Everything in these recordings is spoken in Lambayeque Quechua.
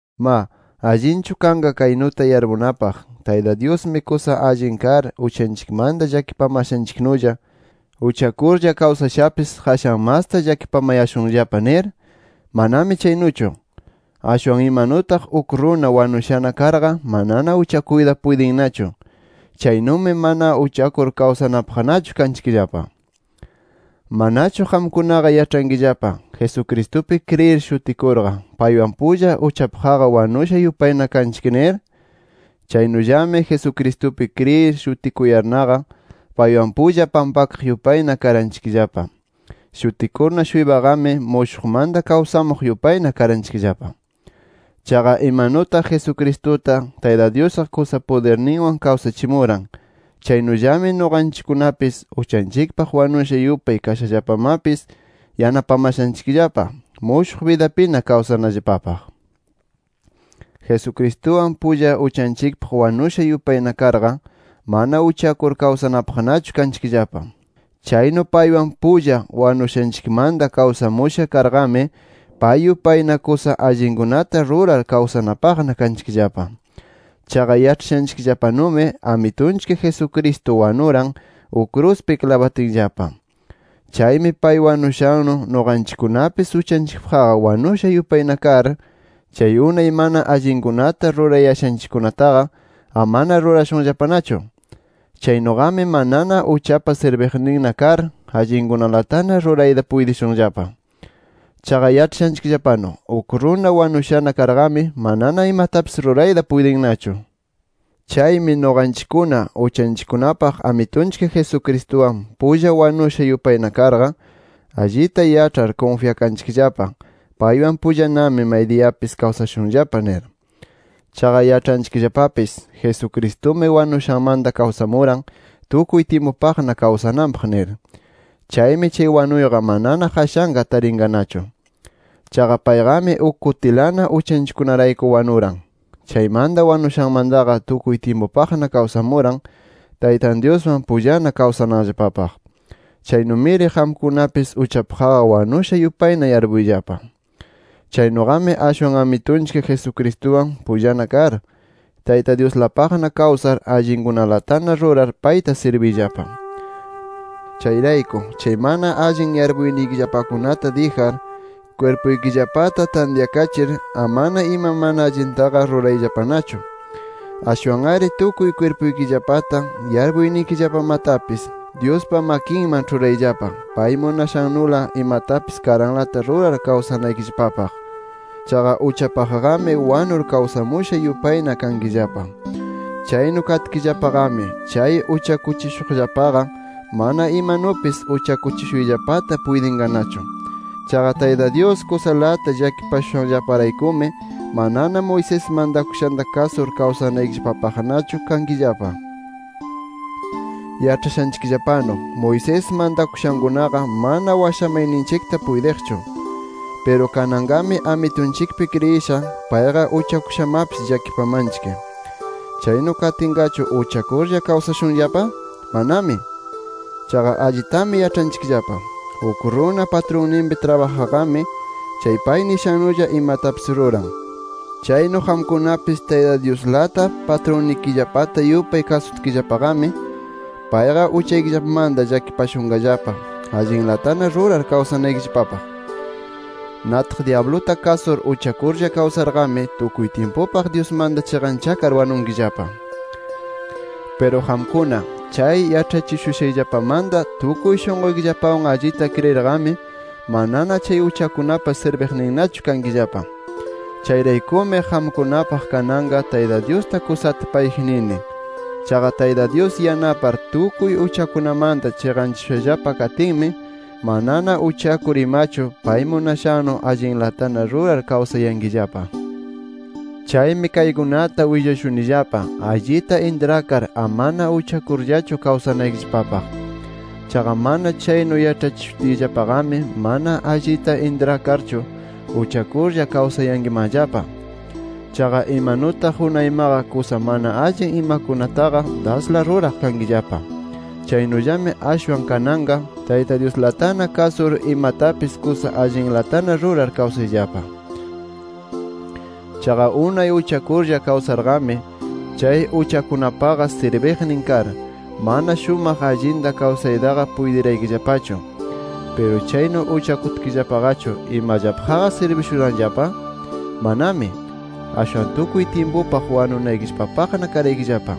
Ma, ¿allinchu kanqa kaynuta yarpunapaq: Tayta Dyusmi kusa allin kar uchanchikmanta llakipamashanchiknulla, uchakurlla kawsashapis qashan masta llakipamayashunllapa nir? ¡Manami chaynuchu! ¡Ashwan imanutaq uk runa wanushana karqa manana uchakuyta puytinnachu, chaynumi mana uchakur kawsanapaqnachu kanchikllapa! ¿Manachu qamkunaqa yaĉhankillapa, Jesucristupi kriyir shutikurqa paywan pulla uchapaqqa wanusha yupayna kanchik nir? Chaynullami Jesucristupi kriyir shutikuyarnaqa, paywan pulla pampakaq yupayna karanchikllapa. Shutikurna-shuypaqami, mushuqmanta kawsamuq yupayna karanchikllapa. Chaqa imanutaq Jesucristuta, Tayta Dyusqa kusa pudirninwan kawsachimuran, chaynullami nuqanchikkunatapis uchanchikpaq wanusha yupay kashallapamapis yanapamashanchikllapa, mushuq bidapina kawsanallapapaq. Jesucristuwan pulla uchanchikpaq wanusha yupayna karqa, mana uchakur kawsanapaqnachu kanchikllapa. Chaynu paywan pulla wanushanchikmanta kawsamusha karnaqami, pay yupayna kusa allinkunata rurar kawsanapaqna kanchikllapa. Chaqa yaĉhashanchikllapanumi Amitunchik Jesucristo wanuran, uk kruspi klabatinllapa. Chaymi pay wanushannu, nuqanchikkunapis uchanchikpaqqa wanusha yupayna kar, chay unay mana allinkunata rurayashanchikkunataqa amana rurashunllapanachu. Chaynuqami manana uchapa sirbiqninna kar, allinkunalatana rurayta puytishunllapa. Chaqa yaĉhashanchikllapanu, uk runa wanushana karqami manana imatapis rurayta puytinnachu. Chaymi nuqanchikkuna, uchanchikkunapaq Amitunchik Jesucristuwan pulla wanusha yupayna karqa, allita yaĉhar kunfyakanchikllapa, paywan pullanami maydiyapis kawsashunllapa nir. Chaqa yaĉhanchikllapapis Jesucristumi wanushanmanta kawsamuran tukuy tyimpupaqna kawsananpaq nir. Chaymi chay wanuyqa manana qashanqa tarinqanachu. Chaqa payqami uk kutilana uchanchikkunarayku wanuran. Chaymanta wanushanmantaqa tukuy tyimpupaqna kawsamuran Taytan Dyuswan pullana kawsananllapapaq. Chaynumiri qamkunapis uchapaqqa wanusha yupayna yarpuyllapa. Chaynuqami, ashwan Amitunchik Jesucristuwan pullana kar, Tayta Dyuslapaqna kawsar allinkunalatana rurar payta sirbiyllapa. Chayrayku chay mana allin yarpuynikillapakunata dijar, kwirpuykillapata tantyakachir, amana ima mana allintaqa rurayllapanachu. Ashwan-ari tukuy kwirpuykillapata, yarpuynikillapamatapis Dyuspa makinman ĉhurayllapa, pay munashannula imatapis karanlata rurar kawsanaykillapapaq. Chaqa uchapaqqami wanur kawsamusha yupayna kankillapa. Chaynu katkillapaqami, chay uchakuchishuqllapaqa, mana imanupis uchakuchishuyllapata puytinqanachu. Chaqa Tayta Dyus kusalata llakipashushanllaparaykumi, manana Moisés mantakushanta kasur kawsanaykillapapaqnachu kankillapa. Yaĉhashanchikllapanu Moisés mantakushankunaqa mana washamayninchikta puytiqchu. Piru kananqami Amitunchikpi kriyisha, payqa uchakushamapis llakipamanchik. ¿Chaynu katinqachu, uchakurlla kawsashunllapa? ¡Manami! Chaqa allitami yaĉhanchikllapa, uk runa patrunpi trabajaqqami chay pay nishannulla imatapis ruran. Chaynu qamkunapis Tayta Dyuslata patrunnikillapata yupay kasutkillapaqami, payqa uchaykillapamanta llakipashunqallapa, allinlatana rurar kawsanaykillapapaq. Nataq dyabluta kasur, uchakurlla kawsarqami tukuy tyimpupaq Dyusmanta chiqanchakar wanunkillapa. Piru qamkuna, chay yaĉhachishushanllapamanta tukuy shunquykillapawan allita kriyirqami, manana chay uchakunapa sirbiqninnachu kankillapa. Chayraykumi, qamkunapaq kananqa Tayta Dyusta kusata payji nini. Chaqa Tayta Dyus yanapar tukuy uchakunamanta chiqanchashushallapa katinmi, manana uchakur imachu pay munashannu allinlatana rurar kawsayankillapa. Chaymi kaykunata willashunillapa allita intrakar amana uchakurllachu kawsanaykillapapaq. Chaqa mana chaynu yaĉhachishutiyllapaqami, mana allita intrakarchu uchakurlla kawsayankimanllapa. Chaqa imanutaq unaymaqa kusa mana allin imakunataqa dasla ruraq kankillapa, chaynullami ashwan kananqa Tayta Dyuslatana kasur imatapis kusa allinlatana rurar kawsayllapa. Chaqa unay uchakurlla kawsarqami, chay uchakunapaqa sirbiqnin kar, mana shumaq allinta kawsaytaqa puytiraykillapachu. Piru chaynu uchakutkillapaqachu, ¿imallapaqqa sirbishuranllapa? ¡Manami! Ashwan tukuy tyimpupaq wanunaykillapapaqna karaykillapa.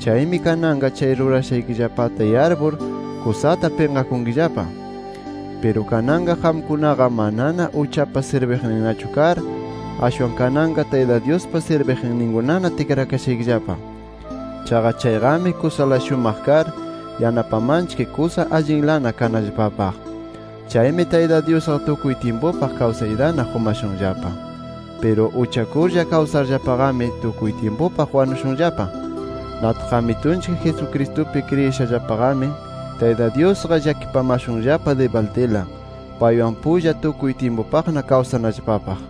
Chaymi kananqa chay rurashaykillapata yarpur, kusata pinqakunkillapa. Piru kananqa qamkunaqa manana uchapa sirbiqninnachu kar, ashwan kananqa Tayta Dyuspa sirbiqninkunana tikrakashaykillapa. Chaqa chayqami kusala shumaq kar, yanapamanchik kusa allinlana kanallapapaq. Chaymi Tayta Dyusqa tukuy tyimpupaq kawsaytana qumashunllapa. Piru uchakurlla kawsarllapaqami tukuy tyimpupaq wanushunllapa. Nataq Amitunchik Jesucristupi kriyishallapaqami, Tayta Dyusqa llakipamashunllapa dibaldila, paywan pulla tukuy tyimpupaqna kawsanallapapaq.